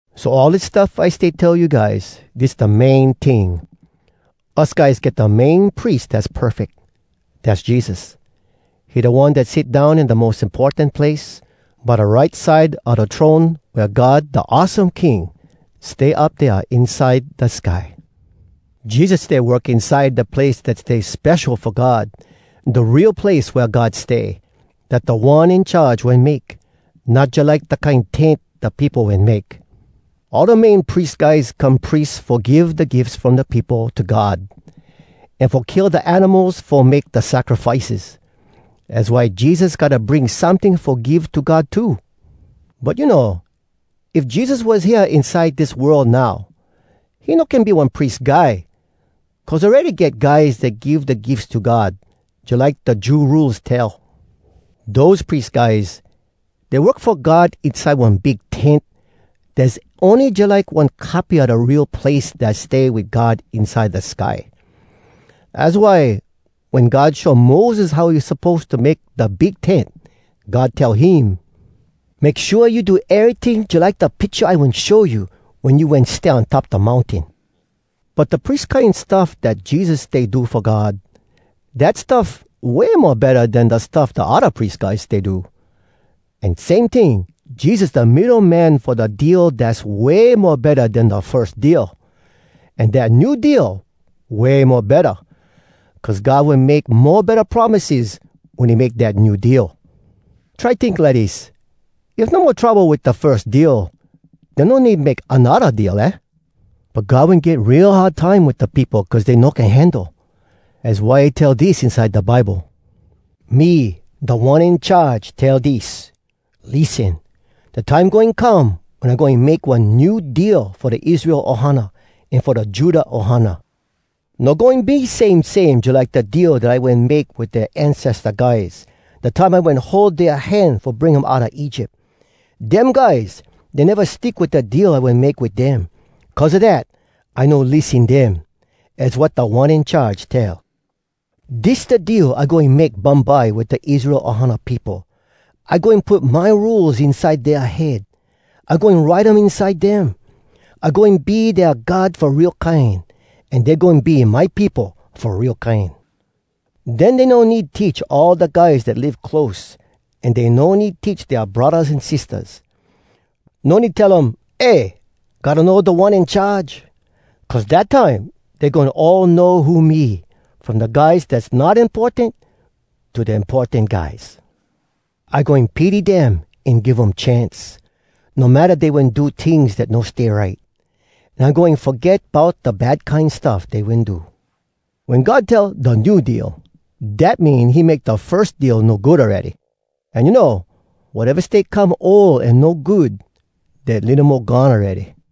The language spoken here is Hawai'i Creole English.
So, all dis stuff I stay tell you guys, dis da main ting: Us guys get da Main Pries dass perfeck. Dass Jesus. He da One dat sit down in da mos importan place, by da right side a da throne wea God Da Awesome King stay up dea inside da sky. Jesus stay work inside da place dat stay spesho fo God, da real place wea God stay, dat Da One In Charge wen make, not jalike da kine tent da peopo wen make. All da Main Pries Guys come pries fo give da gifs from da peopo to God, an fo kill da animals fo make da sacrifices. Az why Jesus gotta bring someting fo give to God too. But you know, if Jesus was hea inside dis world now, he no can be one pries guy, cuz awready get guys dat give da gifs to God, jalike da Jew Rules tell. Dose pries guys, dey work fo God inside one big tent dass ony jalike one copy a da real place dat stay wit God inside da sky. Az why, wen God show Moses how he suppose to make da big tent, God tell him, “Make shua you do eryting jalike da picha I wen show you wen you wen stay on top da mountain.” But da pries kine stuff dat Jesus stay do fo God, dat stuff way mo betta den da stuff da odda pries guys stay do. An same ting, Jesus da middo man fo da deal dass way mo betta den da firs deal. An dat New Deal way mo betta, cuz God wen make mo betta promises wen he make dat New Deal. Try tink lidis, if no mo trouble wit da firs deal, den no need make anodda deal, aah? But God wen get real hard time wit da peopo cuz dey no can handle. Az why he tell dis inside da Bible: “Me, Da One In Charge, tell dis: ‘Lissen! Da time goin come, Wen I goin make one New Deal Fo da Israel ohana, An fo da Judah ohana. No goin be same same jalike da deal Dat I wen make wit dea ancesta guys, Da time I wen hold dea hand Fo bring um outa Egypt. Dem guys, dey neva stick wit da deal I wen make wit dem. Cuz a dat, I no lissen dem.’ Az wat Da One In Charge tell. ‘Dis da deal I goin make bumbye Wit da Israel ohana peopo. I goin put my Rules inside dea head. I goin write um inside dem. I goin be dea God fo real kine, An dey goin be my peopo fo real kine. Den dey no need teach all da guys dat live close, An dey no need teach dea braddahs an sistahs. No need tell um, “Eh! Gotta know Da One In Charge!” Cuz dat time, dey goin all know who me, From da guys dass not importan to da importan guys. I goin pity dem an give um chance, No matta dey wen do tings dat no stay right. An I goin foget bout Da bad kine stuff dey wen do.’” Wen God tell “da New Deal,” dat mean he make da firs deal no good awready. An you know, wateva stay come ol an no good, dat litto mo gone awready.